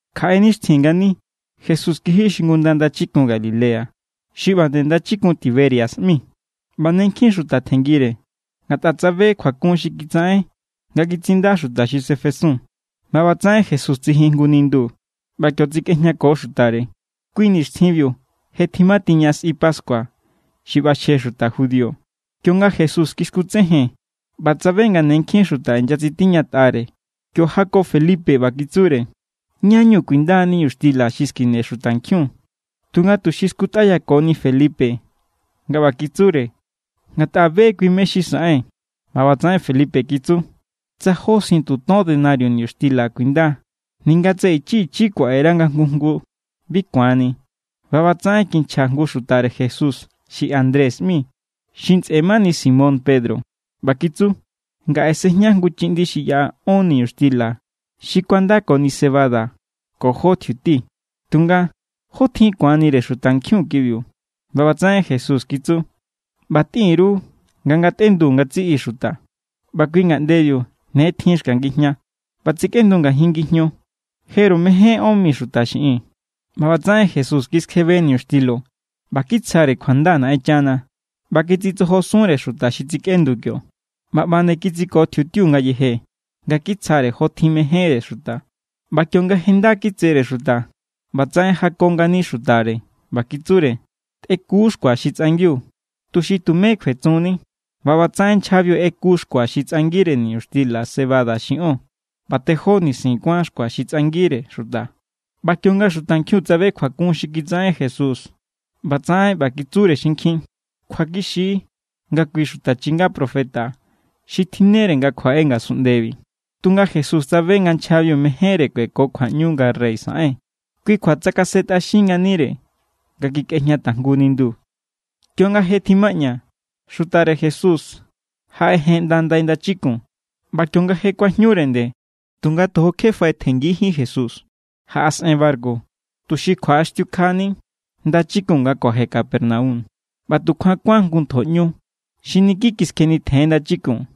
Kjaꞌe nixtjin ngani Jesús kiji xingunda ndachikun Galilea, xi ꞌba nde ndachikun Tiberias ꞌmi. ꞌBa ne nkjin xuta tjenngire, ngatꞌa tsabe kjuakun xi kitsaꞌen nga kitsinda xuta xi sefesun. ꞌBa ꞌbatsaꞌen Jesús tsijin jngu nindu ꞌba kio tsekꞌejñako xutare. Kui nixtjinbiu je tjimatiña sꞌi pascua xi ꞌbaxje xuta judío. Kionga Jesús kiskutsejen ꞌba tsabe nga ne nkjin xuta inyatsitiñatꞌare, kio jako Felipe ꞌba kitsure: —¿Ñá=ñu kuinda niñuxtila xi skine xutankjiun? Tunga tuxi skutꞌáyakoni Felipe nga ꞌba kitsure, ngatꞌa be= kui mé= xi saꞌen. ꞌBa ꞌbatsaꞌen Felipe kitsu: —Tsa jó sientu ton denario niñuxtila kuinda, ninga tsa ichi ichi kuaꞌere nga jngu jngu, bi ku̱anni. ꞌBa ꞌbatsaꞌen kinchja jngu xutare Jesús xi Andrés ꞌmi, xi ntsꞌe mani Simón Pedro ꞌba kitsu: —Ngaꞌe sejña jngu chiꞌndi xi yaꞌa ón niñuxtila xi kuandakoni cebada ko jó tjiuti. Tunga, ¿jótjin ku̱anire xutankjiun kibiu? ꞌBa ꞌbatsaꞌen Jesús kitsu: —ꞌBa tꞌin_ru nga ngatꞌendu ngatsiꞌi xuta. ꞌBa kui ngaꞌndebiu ne tjin xka ngijña, ꞌba tsekꞌendu ngajin ngijño jeru mején ón mi xuta xiꞌin. ꞌBa ꞌbatsaꞌen Jesús kiskjebe niñuxtilo ꞌba kitsjare kjuanda Naꞌenchana ꞌba kitsitsojosunre xuta xi tsikꞌendu kio. ꞌBa ꞌba nde kitsiko tjiutiu ngayeje nga kitsjare jotjin mejénre xuta. ꞌBa kionga je nda kitsere xuta, ꞌbatsaꞌen jako ngani xutare ꞌba kitsure: —Tꞌeku xkua xi tsꞌangiu, tuxi tumé kjuetsunni. ꞌBa ꞌbatsaꞌen nchjabiu ꞌeku xkua xi tsꞌangire niñuxtila cebada xi ón, ꞌba tejó nisin kuán xkua xi tsꞌangire xuta. ꞌBa kionga xutankjiun tsabe kjuakun xi kitsaꞌen Jesús, ꞌbatsaꞌen ꞌba kitsure xinkjin: —Kjuakixi= nga kui xuta chinga profeta xi tjinnere nga kjuaꞌe ngasunꞌndebi. Tunga Jesús tsabe nga nchjabiu mejénre kueko kjuaꞌñu nga rey saꞌen. Kui kjua tsakasentꞌaxin nganire nga kikꞌejña tajngu nindu. Kionga je tjimaꞌña, xutare Jesús jaꞌejen ꞌnda ndai ndachikun. ꞌBa kionga je kuajñure nde, tunga tojo kje faꞌetjenngijín Jesús, jaꞌasꞌen barku, tuxi kjuaꞌaxtiukjani ndachikun nga kuaje Capernaum. ꞌBa tukjuan kuán jngu ntjo ꞌñu xi niki kiskjenitjen ndachikun.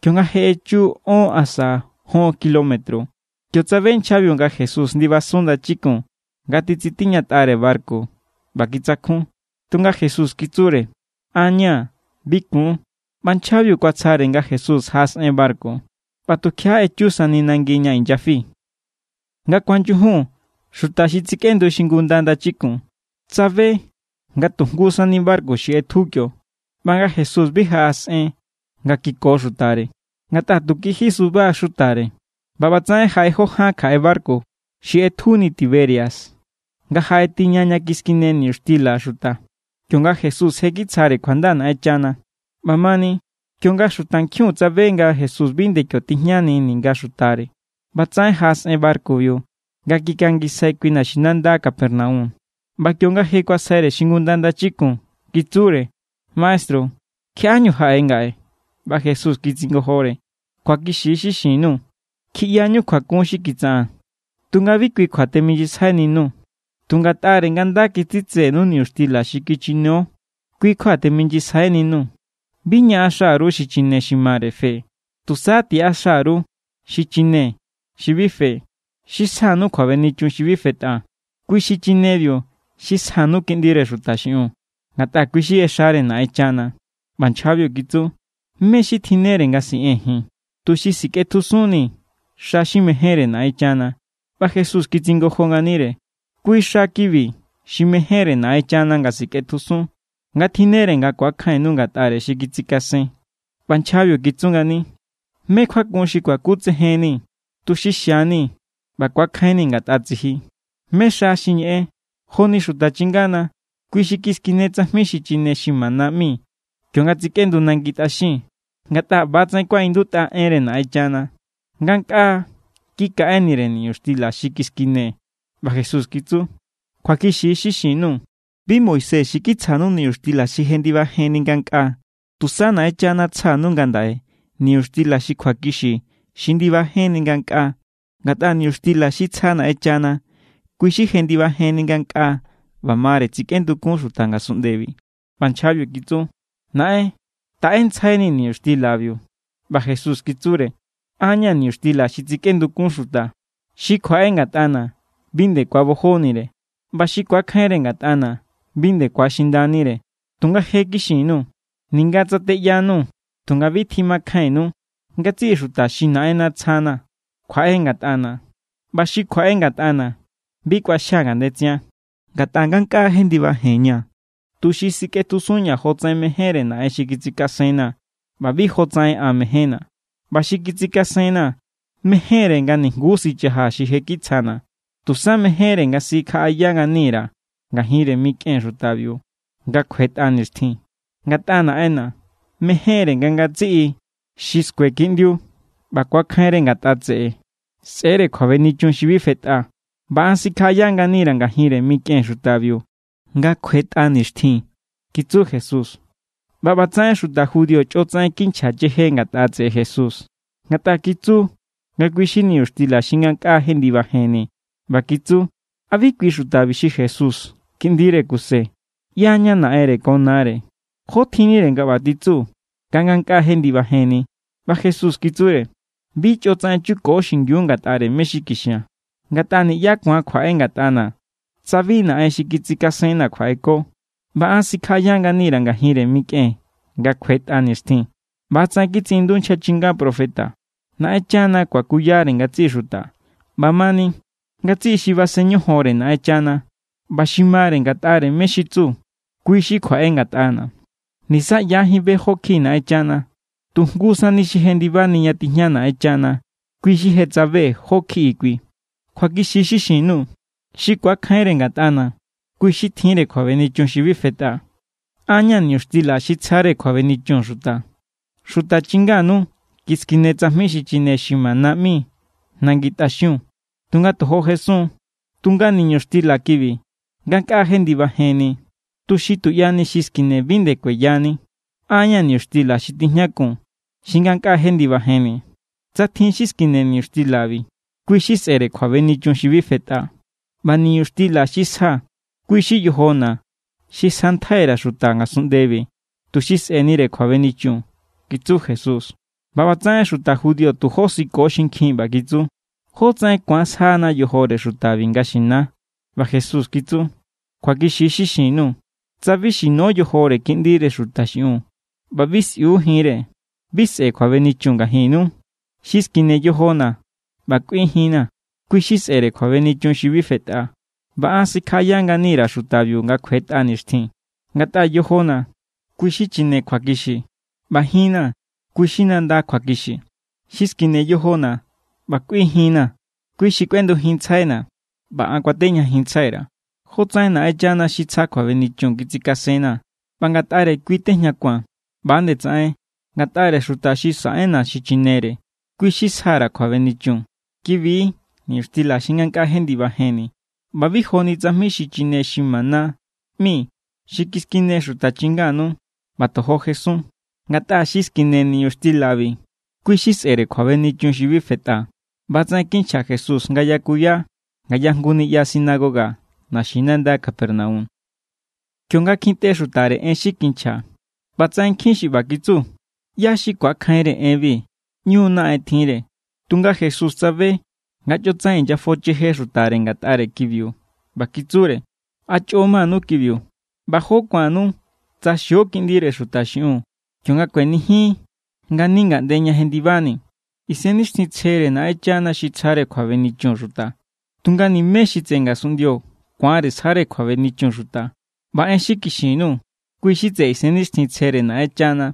Kionga je echu ón asa jon kilómetro, kio tsabe nchjabiu nga Jesús ndibasun ndachikun nga titsitiñatꞌare barku, ꞌba kitsakjun. Tunga Jesús kitsure: —An= ña̱. Bi kun. ꞌBa nchjabiu kuatsjare nga Jesús jaꞌasꞌen barku, ꞌba tukjiaꞌa echu sani nangi ña inyafi. Nga kuanyujun xuta xi tsekꞌendu xingunda ndachikun tsabe nga tu jngu sani barku xi ꞌetju kio ꞌba nga Jesús bi jaꞌasꞌen nga kiko xutare, ngatꞌa tu kiji suba= xutare. ꞌBa ꞌbatsaꞌen jaꞌe jó ján kjaꞌe barku xi ꞌetjuni Tiberias nga jaꞌetiña ña kiskine niñuxtila xuta, kionga Jesús je kitsjare kjuanda Naꞌenchana. ꞌBamani, kionga xutankjiun tsabe nga Jesús bi nde kio tijñani ninga xutare, ꞌbatsaꞌen jaꞌasꞌen barkubiu nga kikangisjai kui naxinanda Capernaum. ꞌBa kionga je kuasjaire xingunda ndachikun, kitsure: —Maestru, ¿kjiaꞌáñu jaꞌe ngaꞌe? ꞌBa Jesús kitsingojore: —Kjuakixi= xi xin_nuu̱. Kjiꞌyañu kjuakun xi kitsaꞌaa̱n, tunga bi kui kjuañu teminyisjaininuu̱. Tu Ngatꞌare= nga nda kitsitsenu niñuxtila xi kichinio, kui kjuañu teminyisjainiñuu̱. Bi ñaꞌaxa_ru xichine xi mare fe. Tusa tiꞌaxa_ru xichine xi bi fe, xi sjanu kjuabenichun xi bi fetꞌa. Kui xichinebiu xi sjanu Kiꞌndire Xuta xiꞌiun, ngatꞌa kui= xi ꞌexare Naꞌenchana. ꞌBa nchjabiu kitsu: —¿Mé= xi tjinnere nga siꞌee̱n ji̱n, tuxi sikꞌetjusunnii̱ xa xi mejénre Naꞌenchana? ꞌBa Jesús kitsingojo nganire: —Kui xa kibi xi mejénre Naꞌenchana nga sikꞌetjusun, nga tjinnere nga ku̱akjainnu ngatꞌare xi kitsikasen. ꞌBa nchjabiu kitsu ngani: —¿Mé= kjuakun xi kuakutsejennii̱, tuxi xianii̱ ꞌba ku̱akjainni̱ ngatꞌa tsiji? ¿Mé= xa xi ñeꞌen? Joni xuta chingana, kui xi kiskine tsajmi xi chine xi mana ꞌmi kionga tsekꞌendu nangi tꞌaxiun. Ngatꞌa ꞌba=tsaꞌen kuaꞌindutꞌa enre Naꞌenchana: “Ngankꞌaa kikaꞌenire niñuxtila xi kiskine.” ꞌBa Jesús kitsu: —Kjuakixi= xi xin_nuu̱. Bi Moisés xi kitsjanu niñuxtila xi jendibajenni ngankꞌaa. Tusa Naꞌenchana̱ tsja_nuu̱ ngandaꞌe niñuxtila xi kjuakixi xi ndibajenni ngankꞌaa. Ngatꞌa niñuxtila xi tsja Naꞌenchana, kui= xi jendibajenni ngankꞌaa ꞌba mare tsikꞌendukun xuta ngasunꞌndebi. ꞌBa nchjabiu kitsu: —Naꞌen, taꞌentsjainii̱ niñuxtilabiu. ꞌBa Jesús kitsure: —An= ña̱ niñuxtila xi tsikꞌendukun xuta. Xi kjuaꞌe ngatꞌana̱ bi nde ku̱abojonire, ꞌba xi ku̱akjainre ngatꞌana̱ bi nde ku̱axindanire. Tunga je kixin_nuu̱, ninga tsa teꞌyanuu̱ tunga bi tjimakjainnu. Ngatsiꞌi xuta xi Naꞌenna̱ tsjana̱ kjuaꞌe ngatꞌana̱, ꞌba xi kjuaꞌe ngatꞌana̱ bi kꞌuaxjia̱ ngandetsian. Ngatꞌa ngankꞌaa jendibajenña̱, tuxi sikꞌetjusunña̱ jotsaꞌen mejénre Naꞌen xi kitsikasenna̱ ꞌba bi jotsaꞌen an mejénna̱. ꞌBa xi kitsikasenna̱ mejénre nga nijnguú sichajaa̱ xi je kitsjana̱. Tusa mejénre nga sikjaꞌaya ngani_ra̱ ngajinre mikꞌen xutabiu nga kjuetꞌa nixtjin. Ngatꞌa Naꞌenna̱ mejénre nga ngatsiꞌi xi skue Kiꞌndiu ꞌba ku̱akjainre ngatꞌa tseꞌe sꞌe̱=re kjuabenichun xi bi fetꞌa. ꞌBa an sikjaꞌaya ngani_ra̱ ngajinre mikꞌen xutabiu nga kjuetꞌa nixtjin —kitsu Jesús. ꞌBa ꞌbatsaꞌen xuta judío chꞌotsaꞌen kinchja cheje ngatꞌa tseꞌe Jesús, ngatꞌa kitsu nga kui= xi niñuxtila xi ngankꞌaa jendibajenni. ꞌBa kitsu: —¿A bi kui xutabi xi Jesús, kiꞌndire Kuse? ꞌYaña naꞌenre ko nare. ¿Jó tjinnire nga ꞌba titsu nga ngankꞌaa jendibajenni? ꞌBa Jesús kitsure: —Bi chꞌotsaꞌen chuko xingiu ngatꞌare mé= xi kixia̱n. Ngatꞌa niꞌyá ku̱an kjuaꞌe ngatꞌana̱ tsa bi Naꞌen xi kitsikasenna̱ kjuaꞌeko, ꞌba an sikjaꞌaya ngani_ra̱ ngajinre mikꞌen nga kjuetꞌa nixtjin. ꞌBa=tsaꞌen kitsiꞌindu nchja chinga profeta: “Naꞌenchana kuakuyare ngatsiꞌi xuta.” ꞌBamani, ngatsiꞌi xi basen ñojonre Naꞌenchana ꞌba xi mare ngatꞌare mé= xi tsu, kui= xi kjuaꞌe ngatꞌana̱. ’Nisa ꞌyajín be jó kjiꞌi Naꞌenchana. Tu jngu sani xi jendibani ña tijña Naꞌenchana, kui= xi je tsabe jó= kjiꞌi kui. Kjuakixi= xi xin_nuu̱. Xi ku̱akjainre ngatꞌana̱, kui= xi tjinre kjuabenichun xi bi fetꞌa. An= ña̱ niñuxtila xi tsjare kjuabenichun xuta. Xuta chinganu kiskine tsajmi xi chine xi mana ꞌmi nangi tꞌaxiun, tunga tojo jesun. Tunga niñuxtila kibi ngankꞌaa jendibajenni, tuxi tuꞌyani xi skine bi nde kueyani. An= ña̱ niñuxtila xi tijñakun xi ngankꞌaa jendibajenni. Tsa tjin xi skine niñuxtilabi, kui= xi sꞌe̱re kjuabenichun xi bi fetꞌa. ꞌBa niñuxtila xi sja, kui= xi yojona̱ xi sjantjai_ra̱ xuta ngasunꞌndebi tuxi sꞌe̱nire kjuabenichun —kitsu Jesús. ꞌBa ꞌbatsaꞌen xuta judío tu josiko xinkjin ꞌba kitsu: —¿Jó tsaꞌen ku̱an sjana yojore xutabi nga xinia? ꞌBa Jesús kitsu: —Kjuakixi= xi xin_nuu̱. Tsa bi xino yojore Kiꞌndire Xuta xiꞌiun ꞌba bi sꞌiu jinre, bi sꞌe̱ kjuabenichun ngajinnu. Xi skine yojona̱ ꞌba kꞌui jinna̱, kui= xi sꞌe̱re kjuabenichun xi bi fetꞌa, ꞌba an sikjaꞌaya ngani_ra̱ xutabiu nga kjuetꞌa nixtjin. Ngatꞌa yojona̱ kui= xi xichine kjuakixi ꞌba jinna̱ kui= xi nanda kjuakixi. Xi skine yojona̱ ꞌba kꞌui jinna̱, kui= xi kꞌuendujinntsjaina̱, ꞌba an kuatejñajinntsjai_ra̱. Jotsaꞌen Naꞌenchana xi tsja kjuabenichun kitsikasenna̱ ꞌba ngatꞌare kui tejñakua̱n, ꞌba=nde tsaꞌen ngatꞌare xuta xi saꞌenna̱ xichinere, kui= xi sja_ra̱ kjuabenichun. Kibi= niñuxtila xi ngankꞌaa jendibajenni ꞌba bi joni tsajmi xi chine xi mana ꞌmi xi kiskine xuta chinganu ꞌba tojo jesun. Ngatꞌa xi skine niñuxtilabi, kui= xi sꞌe̱re kjuabenichun xi bi fetꞌa. ꞌBa=tsaꞌen kinchja Jesús nga yakuya ngaya jngu niꞌya sinagoga naxinanda Capernaum. Kionga kjintꞌe xutare en xi kinchja, ꞌbatsaꞌen nkjin xi ꞌba kitsu: —¿ꞌYá= xi ku̱akjainre enbi? ꞌÑu= naꞌen tjinre. Tunga Jesús tsabe nga chꞌotsaꞌen inyafocheje xutare ngatꞌare kibiu ꞌba kitsure: —¿A chꞌo manu kibiu? ¿ꞌBa jó ku̱annu tsa xio Kiꞌndire Xuta xiꞌiun kionga kuenijin ngani ngaꞌnde ña jendibani? Isennixtjintsjere= Naꞌenchana xi tsjare kjuabenichun xuta, tunga niꞌmé xi tseꞌe ngasunꞌndio ku̱anre sjare kjuabenichun xuta. ꞌBa en xi kixin_nuu̱, kui= xi tseꞌe Isennixtjintsjere Naꞌenchana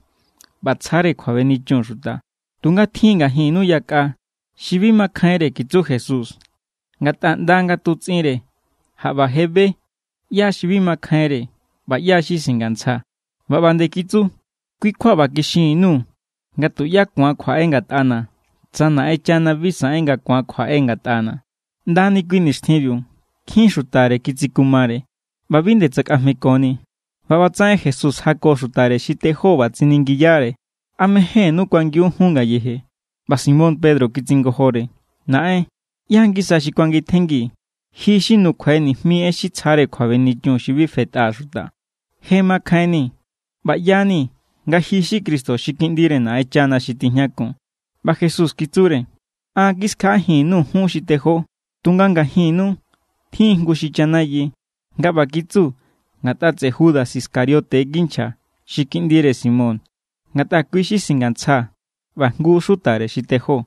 ꞌba tsjare kjuabenichun xuta. Tunga tjin= ngajinnu yakꞌa xi bi makjainre kitsu Jesús, ngatꞌa ꞌnda nga tutsꞌinre jaꞌba be= ꞌyá xi bi makjainre ꞌba ꞌyá xi singantsja. ꞌBa ꞌba nde kitsu: —Kui= kjua ꞌba kixinni_nuu̱ nga tuꞌyá ku̱an kjuaꞌe ngatꞌana̱ tsa Naꞌenchana bi saꞌen nga ku̱an kjuaꞌe ngatꞌana̱. ꞌNda kui nixtjinbiu nkjin xutare kitsikumare ꞌba bi nde tsakꞌajmekoni. ꞌBa ꞌbatsaꞌen Jesús jako xutare xi tejó ꞌba tsiningiyare: —¿A mejénnú kuangiun jun ngayeje? ꞌBa Simón Pedro kitsingojore: —Naꞌen, ¿ꞌyá= ngisa xi kuangitjenngii̱? Ji= xi nukjua nijmi en xi tsjare kjuabenichun xi bi fetꞌa xuta. Je makjainni̱ ꞌba ꞌya=ni nga ji= xi Cristo, xi Kiꞌndire Naꞌenchana xi tijñakun. ꞌBa Jesús kitsure: —An= kiskjaꞌajin_nuu̱ jun xi tejó, tunga ngajinnu tjin jngu xi chanayi. Nga ꞌba kitsu ngatꞌa tseꞌe Judas Iscariote kinchja. Xi kiꞌndire Simón. Ngatꞌa kui= xi singantsja ꞌba jngu xutare xi tejó.